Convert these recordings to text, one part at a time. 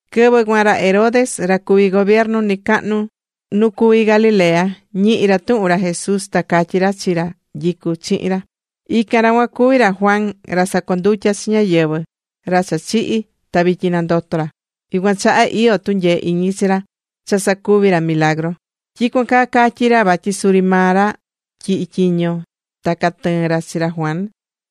Quɨvɨ cuan ra Herodes, ra cuví gobiernu nɨcahnu nu cuví Galilea, ñihi̱ ra tuhun ra Jesús. Ta catyí ra chi ra nyicú chihin ra: ―Ican ra cuan cuví ra Juan ra sacondutya̱ chi ñáyɨvɨ, ra cha chihi̱ ta vityin nandoto̱ ra. Yucuan chaha iyó tunyee iñi chi ra cha sacuví ra milagru. Tyicuan caa catyi̱ ra vatyi suri maa ra tyihi̱ tyiño ta catɨɨ̱n ra chi ra Juan.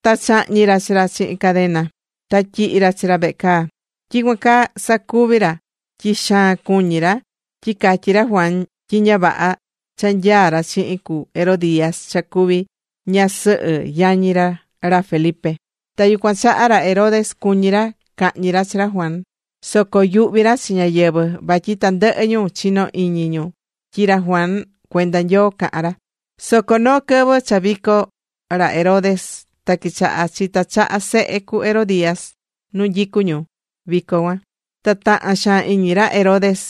Ta chahñi̱ ra chi ra chihin cadena, ta tyihi ra chi ra vehe caa. Tyicuan caa sacuvi̱ ra tyi xaan cuñí ra tyi catyi̱ ra Juan tyi ña vaha cha nyaá ra chihin cu Herodías cha cuví ña ñasɨhɨ yañi ra ra Felipe. Ta yucuan chaha, ra Herodes, cuñi̱ ra cahñi ra chi ra Juan, soco yuhvi̱ ra chi ñáyɨvɨ, vatyi tandɨhɨ ñu chinó iñi ñu tyi ra Juan cuenda Nyoo cahán ra. Soco noo quɨvɨ cha vico ra Herodes, ta quichahá chita chaha sehe cu Herodías nu nyicú ñu vico cuan. Ta taha̱n xaan iñi ra Herodes.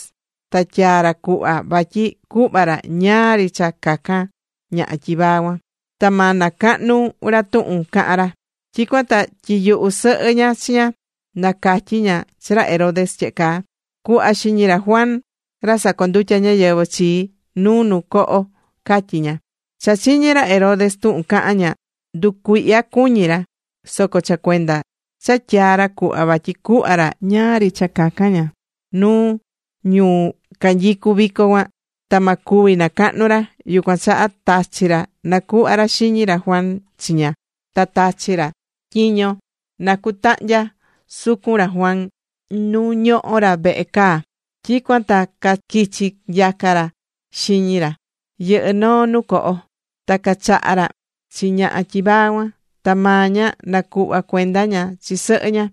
Ta tyaa̱ ra cuhva vatyi cuhva ra ñáá ri cha cacan ñaha tyivaa cuan, ta ma nacahnu ra tuhun cahan ra. Tyicuan ta tyiyuhu̱ sɨhɨ ña chi ña, na catyi ña chi ra Herodes tyehe caa: ―Cu̱hva xiñi ra Juan ra sacondutya ñáyɨvɨ chii nu noo coho ―catyi̱ ña. Cha chiñi̱ rey Herodes tuhun caha̱n ña, nducuihya̱ cuñi ra. Soco cha cuenda cha tyaa̱ ra cuhva vatyi cuhva ra ñáá ri cha cacan ña nuu ñu canyicú vico cuan ta ma cuvi nacahnu ra, yucuan chaha tachi̱ ra nacuhva ra xiñi ra Juan chi ña. Ta tachi̱ ra tyiño na cutahnya sucun ra Juan nu ñohó ra vehe caa. Tyicuan ta caquichi̱ nyaca ra xiñi ra, yɨhɨ́ noo nu coho. Ta cachaha̱ ra chi ñaha tyivaa cuan. Ta maa ña nacuhva̱ cuenda ña chi sɨhɨ ña.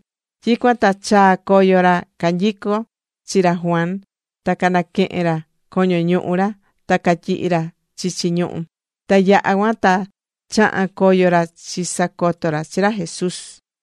Tyicuan ta chaa̱ coyo ra canyico̱n chi ra Juan ta canaquehe̱n ra coño ñuhu ra, ta catyihi̱ ra chichi ñuhu. Ta yaha̱ cuan ta chaha̱n coyo ra chisacoto ra chi ra Jesús.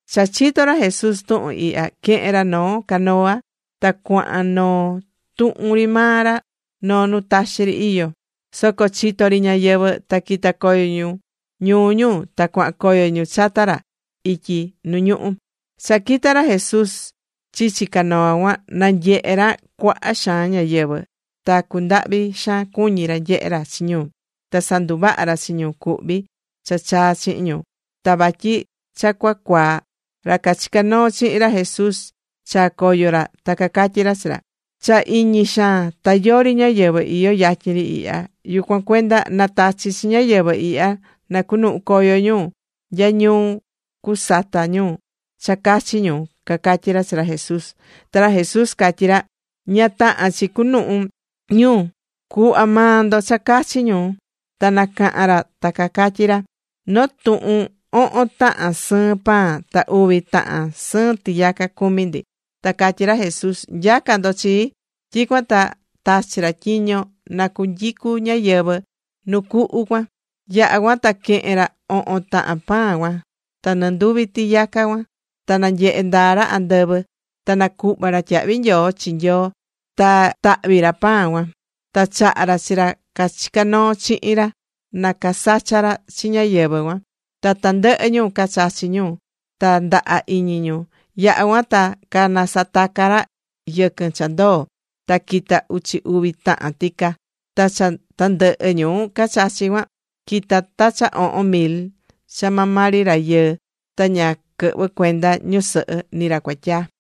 Cha chito̱ ra Jesús tuhun ihya, quehe̱n ra noo canoa, ta cuahan noo tuhun ri maa ra noo nu taxi ri iyó. Soco chito̱ ri ñáyɨvɨ, ta quita̱ coyo ñu ñuu ñu, ta cuahan coyo ñu chata ra ityi nu ñuhú. Cha quita̱ ra Jesús chichi canoa cuan, nanyehe̱ ra cuaha xaan ñáyɨvɨ. Ta cundahvi̱ xaan cuñi̱ ra nyehé ra chi ñu. Ta sanduvaha̱ ra chi ñu cuhví cha chaa̱ chihin ñu. Ta vatyi cha cua cuaa̱, ra cachicá noo chihin ra Jesús chaa coyo ra, ta catyí ra chi ra: ―Cha iñi xaan, ta yori ñáyɨvɨ iyó yatyin ri ihya. Yucuan cuenda na̱tachi chi ñáyɨvɨ ihya na cunuhu coyo ñu nya ñuu cusata ñu cha cachi ñu ―cacatyí ra chi ra Jesús. Ta ra Jesús catyí ra: ―Ña tahán chi cuhun ñu. Cu̱hva maa ndo cha cachi ñu. Ta nacaha̱n ra ta cacatyí ra: ―Noo tuhun ohon tahan sɨɨn pan ta uvi tahan sɨɨn tiyaca cumí ndi. Ta catyí ra Jesús: ―Nya̱ca ndo chii. Tyicuan ta tachi̱ ra tyiño na cunyicu ñáyɨvɨ nu cuhu cuan. Yaha̱ cuan ta quehe̱n ra ohon tahan pan cuan, ta ni nduvi tiyaca cuan. Ta nanyehe̱ ndaa ra andɨvɨ, ta nacuhva̱ ra tyahvi nyoo chi Nyoo ta tahvi̱ ra pan cuan. Ta chaha̱ ra chi ra cachicá noo chihin ra, na casacha ra chi ñáyɨvɨ cuan. Ta tandɨhɨ ñu cachachi̱ ñu ta ndaha iñi ñu. Yaha̱ cuan ta canasataca̱ ra yɨquɨn cha ndoo̱. Ta quita̱ uchi uvi tahan tica. Ta cha tandɨhɨ ñu cachachi̱ cuan, quita̱ ta cha ohon mil cha maa ri maa rayɨɨ. Ta ña quɨhvɨ̱ cuenda ñusɨhɨ ni ra cuatyaa.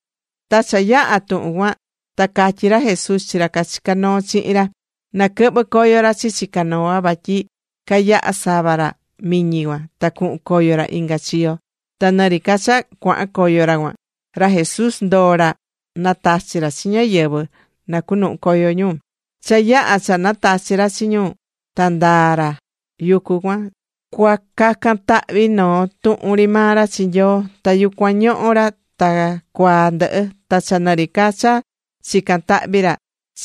Ta cha yaha tuhun cuan ta catyí ra Jesús chi ra cachicá noo chihin ra, na quɨhvɨ coyo ra chichi canoa, vatyi cayaha sava ra miñi cuan ta cuhun coyo ra inga chiyo. Ta nɨri ca cha cuahan coyo ra cuan, ra Jesús ndoo ra natachi ra chi ñáyɨvɨ na cuhun coyo ñu. Cha yaha̱ cha natachi̱ ra chi ñu cuan, ta ndaa̱ ra yucu cuan cua cacan tahvi noo tuhun ri maa ra chi Nyoo. Ta yucuan ñohó ra ta cuaa ndɨhɨ. Ta cha nɨ ri ca cha chicán tahvi ra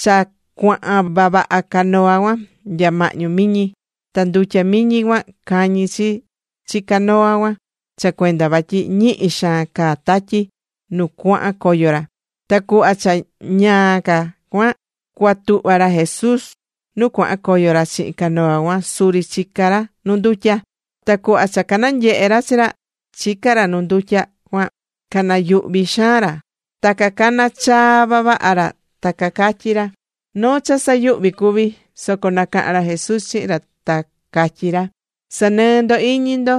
cha cuahan vavaha canoa cuan nya mahñu miñi. Ta ndutya miñi cuan cañí chi chi canoa cuan cha cuenda vatyi ñihi xaan caá tatyi nu cuahan coyo ra. Ta cuhva cha ñaa ca cuan cua tuhva ra Jesús nu cuahan coyo ra chihin canoa cuan suri chicá ra nu ndutya. Ta cuhva cha cananyehe̱ ra chi ra, chicá ra nu ndutya cuan, canayuhvi̱ xaan ra. Ta cacana chaa vavaha ra, ta catyí ra: ―¡Noo cha sayuhvi cuví! Soco nacahan ra Jesús chihin ra, ta catyí ra: ―¡Sa̱nɨɨ ndo iñi ndo,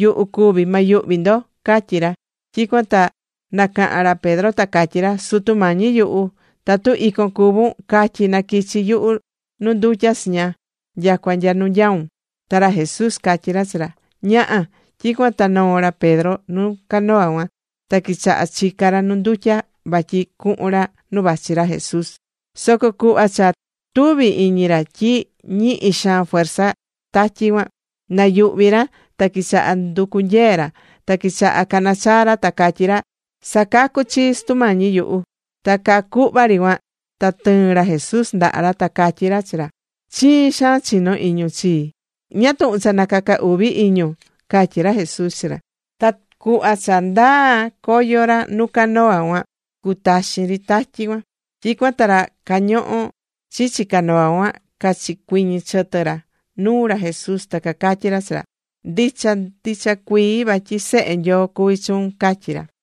yuhu cuví, ma yuhvi ndo! ―catyí ra. Tyicuan ta nacaha̱n ra Pedro ta catyí ra: ―Sutu Mañi yuhu, tatu icon cuvún, ca̱tyi na quichi yuhu nu ndutya chiña nyacua nya nu vachun. Ta ra Jesús catyí ra chi ra: ―Ña̱ha. Tyicuan ta noo̱ ra Pedro nu canoa cuan, ta quichaha̱ chica ra nu ndutya vatyi cuhun ra nu vachi ra Jesús. Soco cuhva cha tuvi̱ iñi ra tyi ñihi xaan fuerza tatyi cuan, nayuhvi̱ ra ta quichaha nducu nyee ra, ta quichaha cana chaa ra ta catyí ra: ―¡Sa̱cacu chii, Sutu Mañi yuhu! Ta caa cuhva ri cuan, ta tɨɨ̱n ra Jesús ndaha ra, ta catyí ra chi ra: ―¡Chiin xaan chinó iñun chii! ¿Ñáá tuhun cha nacaca uvi iñun? ―catyí ra Jesús chi ra. Ta cuhva cha ndaa̱ coyo ra nu canoa cuan, cutaxin ri tatyi cuan. Tyicuan ta ra cañohó chichi canoa cuan cachicuiñi̱ chɨtɨ ra nuu ra Jesús, ta cacatyí ra chi ra: ―Ndicha ndicha cuii vatyi Sehe Nyoo cuví chuun ―cacatyí ra.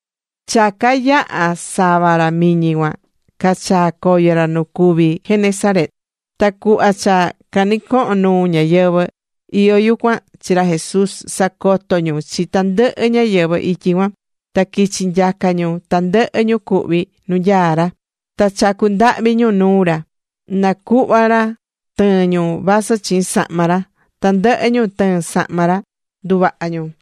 Cha cayaha̱ sava ra miñi cuan, cachaa̱ coyo ra nu cuví Genesaret. Ta cuhva cha canɨcoho̱n nuu ñáyɨvɨ iyó yucuan chi ra Jesús, sacoto ñu chi tandɨhɨ ñáyɨvɨ ityi cuan. Ta quichi̱ nyaca ñu tandɨhɨ ñu cuhví nu nyaá ra. Ta chacú ndahvi ñu nuu ra, na cuhva ra tɨɨn ñu vasɨ chiin sahma ra. Ta tandɨhɨ ñu tɨɨ̱n sahma ra, nduvaha̱ ñu.